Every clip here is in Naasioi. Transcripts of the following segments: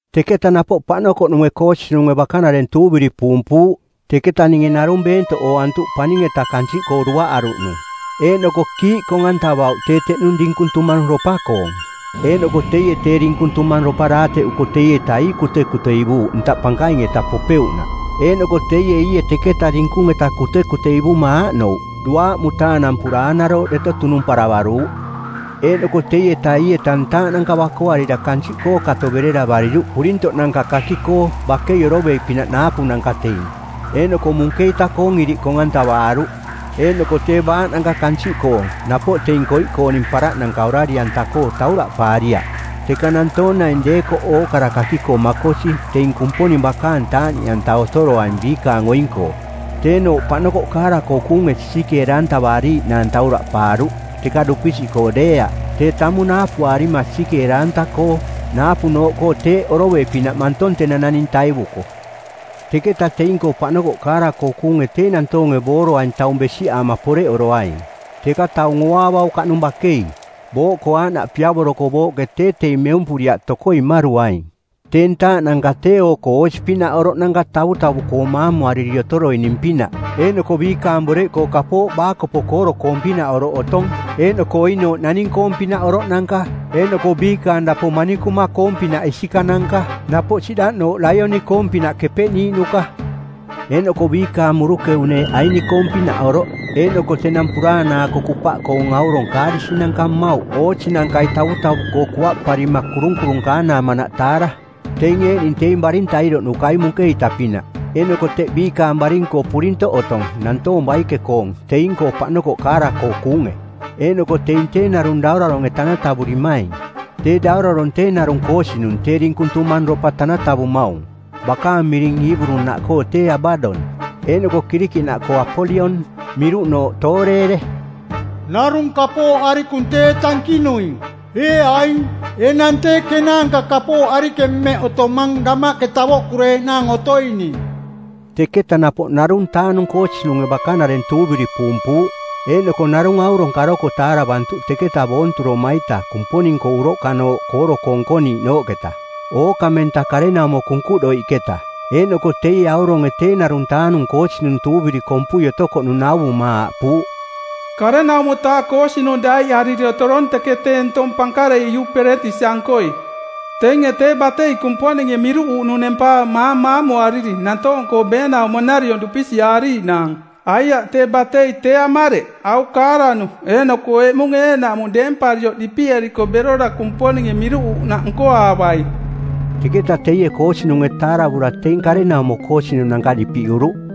Teketa napoꞌ paꞌnokoꞌnunge koosinunge bakanareng tuuviri puumpuuꞌ. Teketa ninge narung beentoꞌ ooantuꞌ paning-eta kansiꞌkoo duaꞌaruꞌnung. Eeꞌnoko kiiꞌ kong-antavauꞌ tee teꞌnung dinkung tumangropa-koong. Eeꞌnoko teie tee dinkung tumangropa daateꞌuko teieta ii kutekuteivuuꞌ ntaꞌ pankaing-eta popeuꞌnaꞌ. Eeꞌnoko teie iie teketa dinkung-eta kutekuteivuma aaꞌnouꞌ: duaaꞌ mutaanampura aanarooꞌ deto tunumparavaruuꞌ. Eeꞌnoko teieta ii-eta ntaaꞌnanka bakoarira kansiꞌkoo kato bereravariruꞌ purintoꞌnanka kaki-koo bakei oroveiꞌpinaꞌ naapunanka teing; eeꞌnoko munkeita-koong iriꞌ kong-antavaaruꞌ. Eeꞌnoko tee baaꞌnanka kansiꞌkoong napoꞌ teing koiꞌkooning paraꞌnanka orari-koo tauraꞌpaariaꞌ, teka nantoong naing deekoꞌ ookara kaki-koo makosi teing Kumponing bakaang taaꞌniꞌanta otoroaing biikaang oing-koo. Tee-nooꞌ paꞌnokoꞌ kaara-koo kuunge sisikeera-antavaariiꞌnaang tauraꞌpaaruꞌ, teka dupisiꞌkoo deeaꞌ, tee tamung naapuaarima sisikeera-anta-koo. Naapunooꞌkoo teeꞌ oroveiꞌ pinaꞌ mantong tenang naning taivuko. Teketa teing-koo paꞌnokoꞌ kaara-koo kuunge tee nantoonge booroaing taung besiꞌaama poreꞌoroaing, teka taung ooaavaukaꞌnung bakei. Booꞌkoo aaꞌnaꞌ piavoroko booꞌke tee teing meumpuriaꞌ tokoi mmaruaing. Tee ntaaꞌnanka tee oo-koo oosi-pinaꞌ oroꞌnanka tavutavuꞌkoo maamuariri otoroining-pinaꞌ, eeꞌnoko biikaang boreꞌkoo kapooꞌ baakopo kooro-koong-pinaꞌ oroꞌ otong. Eeꞌnoko oinooꞌ naning-koong-pinaꞌ oroꞌnanka. Eeꞌnoko biikaang dapo manikuma-koong-pinaꞌ isikananka, napoꞌ siꞌdaꞌnooꞌ laioni-koong-pinaꞌ kepeꞌniiꞌnuka. Eeꞌnoko biikaang murukeu-neeꞌ aini-koong-pinaꞌoroꞌ, eeꞌnoko tenang puraanaako kupaꞌkoong aurong kaarisinanka mmauꞌ oosinankai tavutavuꞌkoo kuaꞌparima kurunkurunkaanaamanaꞌ taara. Teing eeꞌning teing baring tairoꞌnukai munkeita-pinaꞌ, eeꞌnoko teꞌ biikaang baring-koo purintoꞌ otong nantoong baike-koong teing-koo paꞌnokoꞌ kaara-koo kuunge. Eeꞌnoko teing tee narung dauraronge˜ tanatavurimaing. Tee daurarong tee narung koosinung tee dinkung tumangropa tanatavumaung. Bakaang miring Iiburu-naꞌkoo tee Abadon, eeꞌnoko Kirikiꞌnaꞌkoo Apolion, miruꞌnooꞌ Tooreere. Narung kapooꞌ arikung tee tankinuing. Ee aing, enang tee kenaanka kapooꞌ arikeng mmeꞌ otomang damaꞌke tavoꞌkureeꞌnaang otoining. Teketa napoꞌ ˜narung-taa-nung koosinunge bakanareng tuuviri puumpuuꞌ, eeꞌnoko narung aurong karoko taaravantuꞌ teketa boonturoma-ita Kumponing-koo uroꞌkanooꞌ kooro-koo nkoniiꞌnooꞌketa, ookamenta karenaumo kunkuꞌdoiꞌketa. Eeꞌnoko teie auronge tee ˜narung-taa-nung koosinung tuuviri kompui otokoꞌnung nauvuma aaꞌpuuꞌ, “˜Karenaumo-taa koosinung daiꞌariri otorong teke tee ntong pankarei Iuperetisi-ankoi. Teinge tee batei Kumponinge miruꞌuuꞌnung nempaamaang maamuariri nantoong-koo beenaumo nariong dupisiꞌaariiꞌnaang; Aiaꞌ, tee batei tee amareꞌ, au kaaranu eeꞌnoko eꞌmung eeꞌnaꞌmung deemparioꞌ dipiꞌeriko berora Kumponinge miruꞌuruꞌnaꞌ nkoaavai.” Teketa teie koosinunge taaravura teing karenaumo koosinunanka dipiꞌuruꞌ.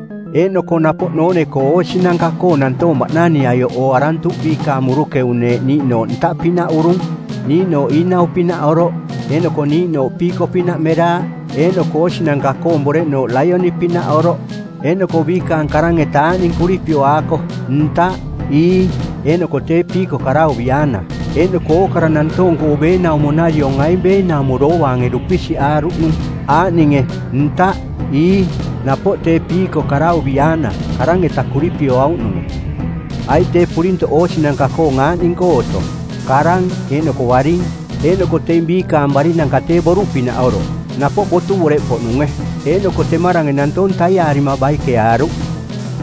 Eeꞌnoko napoꞌ noone-koo oosinanka-koo nantoong baꞌnaniꞌaioꞌ ooarantuꞌ biikaang murukeu-neeꞌ niiꞌnooꞌ ntaꞌpinaꞌ urung, niiꞌnooꞌ iinau-pinaꞌ oroꞌ, eeꞌnoko niiꞌnooꞌ piiko-pinaꞌ meraaꞌ. Eeꞌnoko oosinanka-koong boreꞌnooꞌ laioni-pinaꞌ oroꞌ, eeꞌnoko biikaang karang-eta aaꞌning kuripioaakoꞌ: ntaꞌ, ii, eeꞌnoko tee piiko karauviaana. Eeꞌnoko ookara nantoong-koo beenaumo-nariong aing beenaumo doovaange dupisiꞌaaruꞌnung, aaꞌninge: ntaꞌ, ii, napoꞌ tee piiko karauviaana, karang-eta kuripioauꞌnunge. Aiꞌ tee purintoꞌ oosinanka-koong aaꞌning-koo otong: karang eeꞌnoko baring. Eeꞌnoko teing biikaang barinanka tee boruꞌpinaꞌ oroꞌ, napoꞌ botu boreꞌpoꞌnunge, eeꞌnoko temarange nantoong taiaarima baikeaaruꞌ.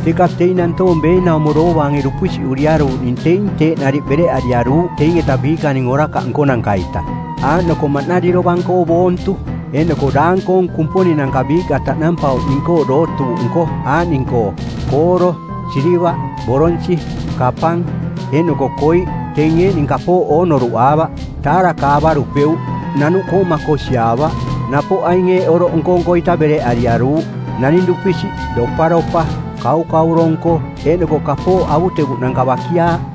Teka teing nantoong beenaumo doovaange dupisiꞌuriaruuꞌning teing teeꞌ nariꞌ bereꞌariaruuꞌ teing-eta biikaning orakaꞌ nkonanka-ita, aaꞌnoko maꞌnari dovang-koo boontu, eeꞌnoko daang-koong kumponinanka biiꞌka taꞌnampauꞌning-koo dootuuꞌ nko aaꞌning-koo: kooro, silivaꞌ, boronsi˜, kapang, eeꞌnoko koiꞌ; teing eeꞌning kapooꞌ oo noruꞌaavaꞌ, taarakaavarupeuꞌ, nanuꞌkoo makosiaavaꞌ. Napoꞌ aing eeꞌ oroꞌ nko-nko-ita bereꞌariaruuꞌ: naning dupisiꞌ, doparopa, kaukauro-nko, eeꞌnoko kapooꞌ avutevuꞌnanka bakiaaꞌ.